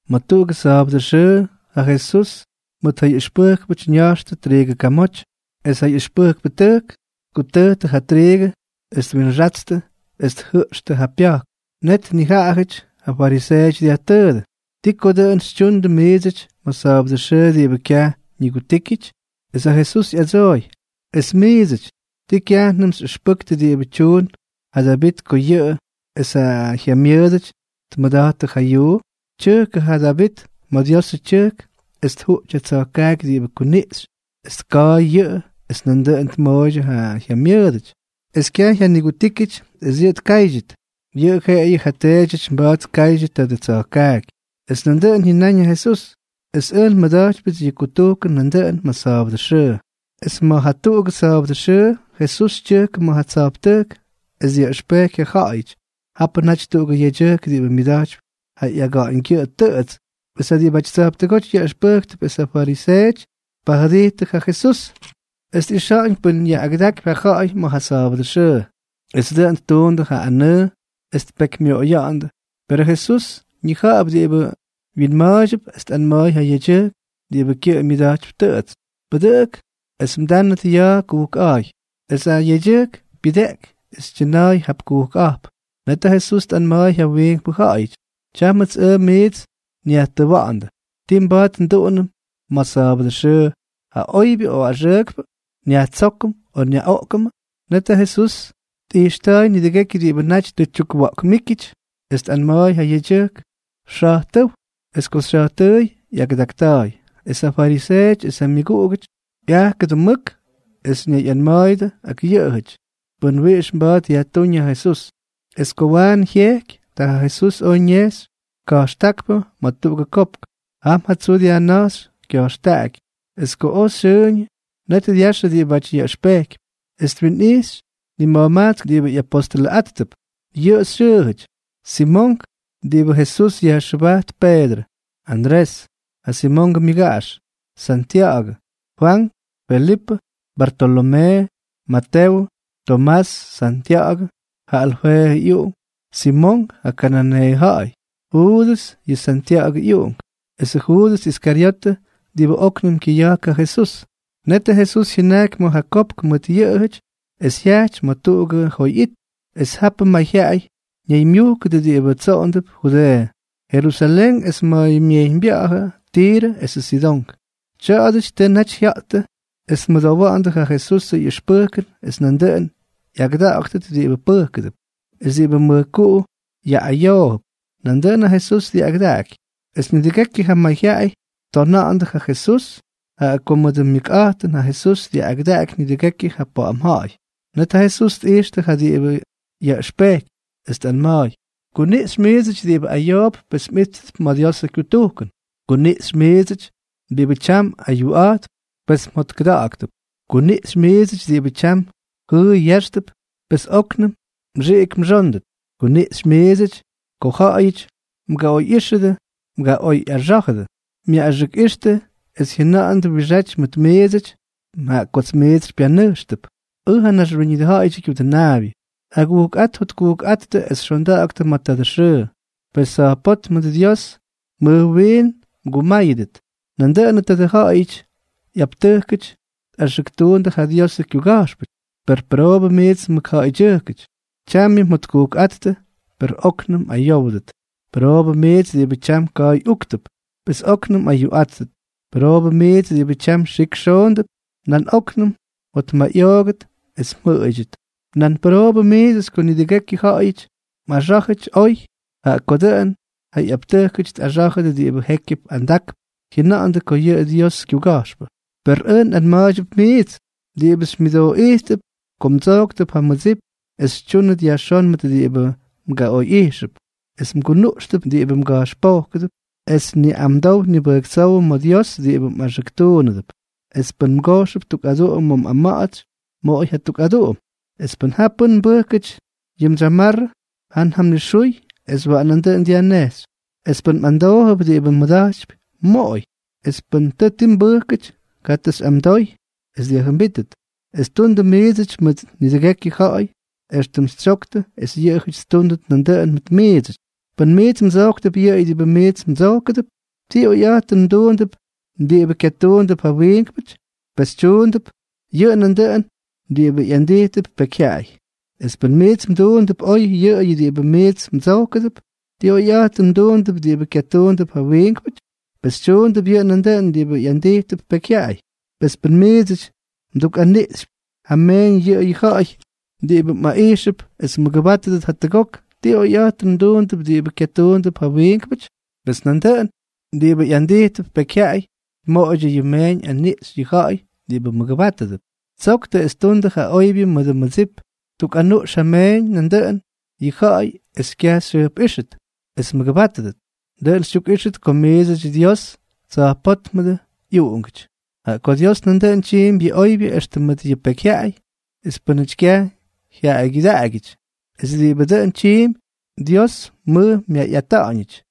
Ma̱ tuꞌugʉ sa̱a̱bʉdʉ xʉʉ ja Jesús mʉt ja ꞌyʉxpʉjkpʉty ña̱jxtʉ triigʉ kamoty. Es ja ꞌyʉxpʉjkpʉtʉjk tkutʉjtʉ ja triigʉ es twinxatstʉ es tjʉꞌxtʉ ja pya̱jk. Net nijaꞌajʉty ja fariseeʉty dyajtʉʉdʉ: —¿Ti ko dʉꞌʉn xytyundʉ miidsʉty ma̱ sa̱a̱bʉdʉ xʉʉ diꞌibʉ kyaj ñigutíkyʉty? Es ja Jesús ꞌyadsooy: —Es miidsʉty, ¿ti kyajnʉm xyꞌʉxpʉktʉ diꞌibʉ tyuun ja Davit ko yʉꞌʉ es ja jyamyʉʉdʉty tmʉda̱jttʉ ja yuu? Tyʉjkʉ ja Davit ma̱ Diosʉ tyʉjk es tjuꞌty ja tsa̱jkaaky diꞌibʉ kuniꞌxy es tka̱a̱y yʉꞌʉ es nandʉꞌʉn tmooydyʉ ja jyamyʉʉdʉty. Es kyaj jyanigutíkyʉty es yʉꞌʉ tkáydyʉt, yʉꞌʉ jeꞌeyʉ ja teedyʉty mba̱a̱t tkaydyʉ tadʉ tsa̱jkaaky. Es nandʉꞌʉn jyʉnáñ ja Jesús: —Es ʉj nmʉda̱jtypyʉts yʉ kutujkʉn nandʉꞌʉn ma̱ sa̱a̱bʉdʉ xʉʉ. Es ma̱ jatuꞌugʉ sa̱a̱bʉdʉ xʉʉ Jesús tyʉjkʉ ma̱ ja tsa̱jptʉjk es dyaꞌʉxpejky ja ja̱ꞌa̱yʉty. Japʉ naty tuꞌugʉ yedyʉjk diꞌibʉ myʉda̱jtypy ja ꞌyaga̱ꞌa̱ñgyʉꞌʉ tʉꞌʉts. Es ja diꞌibʉty tsa̱jptʉgóty yaꞌʉxpʉjktʉp es ja fariseeʉty tpajʉdijttʉ ja Jesús es tꞌixa̱ꞌa̱ñ pʉn yaꞌꞌagʉdakypy ja ja̱ꞌa̱y ma̱ ja sa̱a̱bʉdʉ xʉʉ, es dʉꞌʉn ttuundʉ ja anʉʉ es tpekymyoꞌoya̱ꞌa̱ndʉ. Perʉ Jesús ñija̱ꞌa̱p diꞌibʉ wyinma̱a̱ydyʉp es tꞌanma̱a̱y ja yedyʉjk diꞌibʉ kyʉꞌʉ myʉda̱jtypy tʉꞌʉts: —Pʉdʉꞌʉk es mdánʉt ya̱a̱ kujkꞌa̱a̱y. Es ja yedyʉjk pyʉdeꞌky es tyʉna̱a̱y jap kujkꞌa̱jp. Net ja Jesús tꞌanma̱a̱y ja wiinkpʉ ja̱ꞌa̱yʉty: —Tyámʉts ʉj miits nyajtʉwa̱ꞌa̱ndʉ: ¿Ti mba̱a̱t nduꞌunʉm ma̱ ja sa̱a̱bʉdʉ xʉʉ, ja oybyʉ o axʉʉkpʉ? ¿Nyajtsókʉm o nyaꞌoꞌkʉmʉ? Net ja Jesús tꞌijxta̱a̱y nidʉgekyʉ diꞌibʉ naty tʉ tyukwa̱ꞌkmíkyʉty, es tꞌanma̱a̱y ja yedyʉjk: —Xa̱jtʉ́w. Es ko xya̱jtʉʉy, ꞌyagʉdakta̱a̱y. Es ja fariseeʉty es ja myʉguꞌugʉty ꞌyajkʉdʉ mʉk es ñayꞌanma̱a̱yʉdʉ ak yʉꞌʉjʉty pʉn wiꞌix mba̱a̱t yajtúñ ja Jesús. Es ko waanʉ jyejky, ta ja Jesús oj ñejxy ka̱jxtákpʉ ma̱ tuꞌugʉ kopk. Jam ja tsuu dyajna̱jxy kya̱jxtaꞌaky. Es ko oj xyʉʉñʉ, net dyaxʉ diꞌibʉty yaꞌʉxpejkypy, es twinꞌijxy nima̱jmajtsk diꞌibʉ ꞌyapostʉlʉꞌáttʉp. Yʉꞌʉ xyʉʉjʉty: Simonk diꞌibʉ Jesús yajxʉbajt Peedrʉ, Andrés, ja Simongʉ myʉgaꞌax, Santya̱ꞌa̱gʉ, Fwank, Felipʉ, Bartolomee, Matewʉ, Tomás, Santya̱ꞌa̱gʉ, ja Alfeeʉ ꞌyuꞌunk, Simonk ja kananeeʉ ja̱ꞌa̱y, Juudʉs yʉ Santya̱ꞌa̱gʉ ꞌyuꞌunk, esʉ Juudʉs Iskaryotʉ diꞌibʉ óknʉm kyʉya̱jk ja Jesús. Netʉ Jesús jyʉnajky ma̱ ja kopk mʉt yʉꞌʉjʉty es jyajty ma̱ tuꞌugʉ joy it. Es japʉ mayjyaꞌay ñaymyujkʉdʉ diꞌibʉ tsoꞌondʉp Judeeʉ, Jerusalén es ma̱ myejyñbya̱ꞌa̱jʉ Tirʉ esʉ Sidón. Tya̱a̱dʉty tʉ naty jya̱ꞌttʉ es tmʉdowa̱ꞌa̱ndʉ ja Jesusʉ ꞌyʉxpʉjkʉn es nandʉꞌʉn ꞌyagʉda̱ꞌa̱ktʉt diꞌibʉ pʉjkʉdʉp. Es diꞌibʉ mʉjkuꞌu yaꞌꞌayoojʉp, nandʉꞌʉn ja Jesús dyaꞌꞌagʉdaky. Es nidʉgekyʉ ja mayjyaꞌay ttonandʉ ja Jesús, jaꞌa ko mʉdʉ myʉkꞌa̱jtʉn ja Jesús dyaꞌꞌagʉdaky nidʉgekyʉ ja pa̱ꞌa̱m ja̱ꞌa̱y. Net ja Jesús tꞌijxtʉ ja diꞌibʉ yaꞌʉxpejkypy, es tꞌanma̱a̱y: —Kuniꞌxy miidsʉty diꞌibʉ ayoodʉp, pes mꞌíttʉp ma̱ Diosʉ kyutujkʉn. ’Kuniꞌxy miidsʉty diꞌibʉ tyam ayuꞌa̱jttʉp, pes mjotkʉda̱ꞌa̱ktʉp. ’Kuniꞌxy miidsʉty diꞌibʉ tyam jʉʉy yáxtʉp, pes óknʉm mxiꞌik mxóndʉt. ’Kuniꞌxy miidsʉty ko ja̱ꞌa̱yʉty mgaꞌoyꞌíxʉdʉ, mgaꞌoyꞌaxá̱jʉdʉ, myaꞌꞌaxʉkꞌixtʉ es jyʉna̱ꞌa̱ndʉ wiꞌixáty mʉt miidsʉty jaꞌa kots miits xypyanʉjxtʉp, ʉj, ja Naxwíñʉdʉ Ja̱ꞌa̱yʉdyʉ Kyudʉnaabyʉ. Agujkꞌát jotkujkꞌáttʉ es xonda̱ꞌa̱ktʉ ma̱ tadʉ xʉʉ, pes, tsa̱jpótmʉ Dios mʉj wiin mgumáyʉdʉt. Nandʉꞌʉn tadʉ ja̱ꞌa̱yʉdyʉ ꞌyaptʉjkʉty tꞌaxʉktundʉ ja Diosʉ kyuga̱jxpʉty. ’¡Per pʉroobʉ miits mʉkja̱ꞌa̱ydyʉjkʉty! Tyamyʉ mjotkujkꞌáttʉ, per óknʉm mꞌayówdʉt. ’¡Pʉroobʉ miidsʉty diꞌibʉ tyam ka̱a̱y úktʉp, pes óknʉm mꞌayuꞌáttʉt! ¡Pʉroobʉ miidsʉty diꞌibʉ tyam xik xoondʉp, pes óknʉm mjotmayꞌoogʉt es mjʉꞌʉydyʉt! ’¡Pʉroobʉ miidsʉty ko nidʉgekyʉ ja̱ꞌa̱yʉty mꞌaxá̱jʉty oy, jaꞌa ko dʉꞌʉn ja ꞌyaptʉjkʉty tꞌaxá̱jʉdʉ diꞌibʉ jékyʉp andakp jyʉna̱ꞌa̱ndʉ ko yʉꞌʉ Diosʉ kyuga̱jxpʉ! ’Per ʉj nꞌanma̱a̱ydyʉp miits diꞌibʉ xymyʉdooꞌijttʉp, ko mdsóktʉp ja mmʉdsip es xytyúnʉt yajxón mʉt diꞌibʉ mgaꞌoyꞌijxʉp, es mgunuꞌxtʉp diꞌibʉ mga̱jxpojkʉdʉp es niꞌamdow nibʉjktsówʉ ma̱ Dios diꞌibʉ mꞌaxʉktuunʉdʉp. Es pʉn mgojxʉp tuk aduꞌum ma̱ mꞌama̱ꞌa̱tsy, moꞌoy jatuk aduꞌum. Es pʉn ja pʉ́n mbʉjkʉty yʉ mdsyamarrʉ, jan ja mnixuy es waꞌan nandʉꞌʉn dyajnejxy. Es pʉ́n mꞌamdoojʉp diꞌibʉ mmʉda̱jtypy, moꞌoy, es pʉ́n tʉ ti mbʉjkʉty, katʉ xyꞌamdoy es dyajjʉmbítʉt. Es tundʉ miidsʉty mʉt nidʉgekyʉ ja̱ꞌa̱y éxtʉm xytsyoktʉ es yʉꞌʉjʉty ttúndʉt nandʉꞌʉn mʉt miidsʉty. ’Pʉn miits mdsojktʉp yʉꞌʉyʉ diꞌibʉ miits mdsojkʉdʉp, ¿ti oyꞌa̱jtʉn mduundʉp diꞌibʉ kyatuundʉp ja wiinkpʉty? Pes tyuundʉp yʉꞌʉ nandʉꞌʉn diꞌibʉ ꞌyandijtʉp pekyjyaꞌay. Es pʉn miits mduundʉp oy yʉꞌʉyʉ diꞌibʉ miits mdsojkʉdʉp, ¿ti oyꞌa̱jtʉn mduundʉp diꞌibʉ kyatuundʉp ja wiinkpʉty? Pes tyuundʉp yʉꞌʉ nandʉꞌʉn diꞌibʉ ꞌyandijtʉp pekyjyaꞌay. Es pʉn miidsʉty mdukꞌaniꞌxypy ja meeñ yʉꞌʉyʉ ja̱ꞌa̱y diꞌibʉ mꞌaꞌijxʉp es mmʉgʉbátʉdʉt jatʉgok, ¿ti oyꞌa̱jtʉn mduundʉp diꞌibʉ kyatuundʉp ja wiinkpʉty? Pes nandʉꞌʉn diꞌibʉ ꞌyandijtʉp pekyjyaꞌay tmoꞌoydyʉ yʉ myeeñ aniꞌxy yʉ ja̱ꞌa̱y diꞌibʉ mʉgʉbátʉdʉp. Tsoktʉ es tundʉ ja oybyʉ mʉdʉ mmʉdsip, tukꞌanuꞌx ja mmeeñ nandʉꞌʉn yʉ ja̱ꞌa̱y es kyaj xyjʉjpꞌíxʉt es mmʉgʉbátʉdʉt, dʉꞌʉn xytyukꞌíxʉt ko miidsʉty Dios Tsa̱jpótmʉdʉ ꞌyuꞌungʉty. Jaꞌa ko Dios nandʉꞌʉn tyiimpy yʉ oybyʉ extʉ mʉt yʉ pekyjyaꞌay es pʉ́nʉty kyaj jyaꞌaygyʉdaꞌagyʉty. Es diꞌibʉ dʉn tyiimpy, Dios mʉj myayꞌata̱ꞌa̱ñʉty.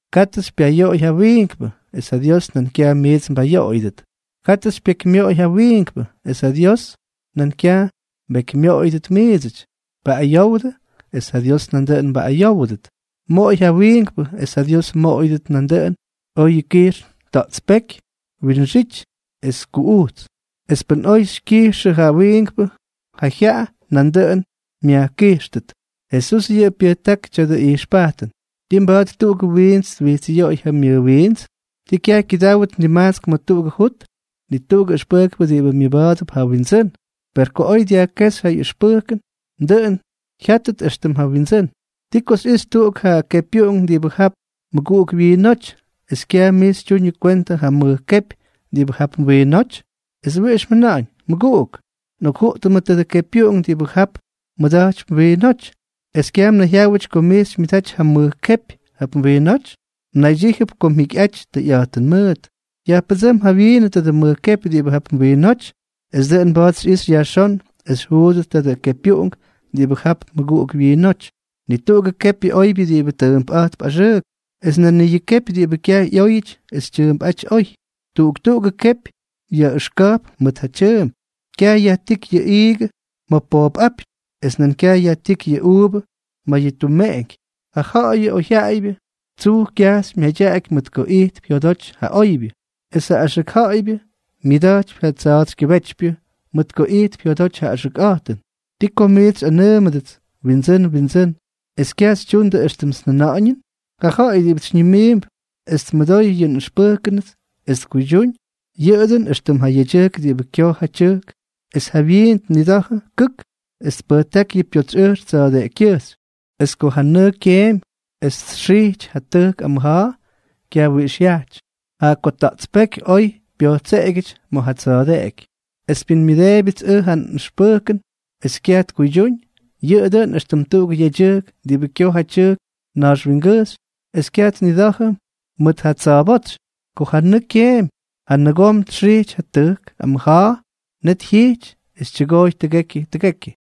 ’Katʉ xypyayoꞌoy ja wiinkpʉ, es ja Dios nan kyaj miits mbayoꞌoyʉdʉt. Katʉ xypyekymyoꞌoy ja wiinkpʉ, es ja Dios nan kyaj mbekymyoꞌoyʉdʉt miidsʉty. Paꞌꞌayowdʉ, es ja Dios nandʉꞌʉn mbaꞌꞌayówʉdʉt. Moꞌoy ja wiinkpʉ, es ja Dios mmoꞌoyʉdʉt nandʉꞌʉn, oyʉ kijxn, ta̱ꞌtspéky, winxity es kuꞌujts. Es pʉn oy xykyijxʉ ja wiinkpʉ ja jyaꞌa, nandʉꞌʉn myajkijxtʉt. Jesús yʉꞌʉ pyʉjtákʉ tya̱dʉ ijxpajtʉn: —¿Ti mba̱a̱t tuꞌugʉ wiints twijtsꞌyoꞌoy ja myʉwiints? ¿Ti kyaj kyʉdáwʉt nimajtsk ma̱ tuꞌugʉ jut? Ni tuꞌugʉ ʉxpʉjkpʉ diꞌibʉ myʉba̱a̱dʉp ja wyindsʉ́n, per ko oy dyajkéxy ja ꞌyʉxpʉjkʉn, dʉꞌʉn jya̱ꞌtʉt éxtʉm ja wyindsʉ́n. ’¿Ti ko xyꞌixy tuꞌuk ja kepywyayuꞌunk diꞌibʉ jap mmʉguꞌuk wyiinóty, es kyaj mij xytyuñʉ kwentʉ ja mʉj kepy diꞌibʉ jap mwiinóty? ¿Es wiꞌix mjʉna̱ꞌa̱ñ: “Mʉguꞌuk, nꞌokjuꞌtʉmʉ tadʉ kepywyayuꞌunk diꞌibʉ jap mmʉda̱jtypy mwiinóty”, es kyaj mnayjyáwʉty ko mij xymyʉdaty ja mʉj kepy jap mwiinóty? Mnaydyíjʉp ko mjikyꞌaty tʉyꞌa̱jtʉn mʉʉt. Yajpʉdsʉ́m jawyiinʉ tadʉ mʉj kepy diꞌibʉ jap mwiinóty, es dʉꞌʉn mba̱a̱t xyꞌixy yajxón es xyjuudʉt tadʉ kepywyayuꞌunk diꞌibʉ jap mmʉguꞌuk wyiinóty. ’Ni tuꞌugʉ kepyʉ oybyʉ diꞌibʉ tʉʉmpꞌa̱jtp axʉʉk, es nan ni yʉ kepy diꞌibʉ kyaj ꞌyóyʉty es tyʉʉmpꞌáty oy. Tuꞌuk tuꞌugʉ kepy yaꞌʉxka̱jp mʉt ja tyʉʉmp. Kyaj yajtíky yʉ iigʉ ma̱ poop apyñ. Es nan kyaj yajtíky yʉ uuvʉ ma̱ yʉ tumeꞌeñky. Ja ja̱ꞌa̱yʉ oyjyaꞌaybyʉ tsuj kyajxy myadyaꞌaky mʉt ko ijtp jyodoty ja oybyʉ, es ja axʉk ja̱ꞌa̱ybyʉ myadyakypy ja tsa̱a̱tsykyʉbétypyʉ mʉt ko ijtp jyodoty ja axʉkꞌa̱jtʉn. ’¿Ti ko miits xyꞌanʉʉmʉdʉts: “Windsʉ́n, Windsʉ́n”, es kyaj xytyundʉ éxtʉmts njʉna̱ꞌa̱ñʉn? Ja ja̱ꞌa̱y diꞌibʉts xyñimiimp es tmʉdoy yʉ nꞌʉxpʉjkʉnʉts es tkuydyúñ, yʉꞌʉ dʉꞌʉn éxtʉm ja yedyʉjk diꞌibʉ kyoj ja tyʉjk. Es jawyiin tnida̱jʉ kʉk es tpʉjtáky yʉ pyotsy ʉjx tsa̱a̱deꞌekykyʉjxy. Es ko ja nʉʉ kyeemy es txijty ja tʉjk amʉja̱a̱, kyaj wiꞌix jyajty, jaꞌa ko ta̱ꞌtspéky oy pyojtseꞌegyʉty ma̱ ja tsa̱a̱deꞌeky. Es pʉ́n myʉdeebyʉts ʉj ja nꞌʉxpʉjkʉn es kyaj tkuydyúñ, yʉꞌʉ dʉꞌʉn éxtʉm tuꞌugʉ yedyʉjk diꞌibʉ kyoj ja tyʉjk nax wingʉjxy es kyaj tnida̱jʉ mʉt ja tsa̱a̱bótsy. Ko ja nʉʉ kyeemy, ja nʉgom txijty ja tʉjk amʉja̱a̱, net jyijty es tyʉgooy tʉgekyʉ tʉgekyʉ.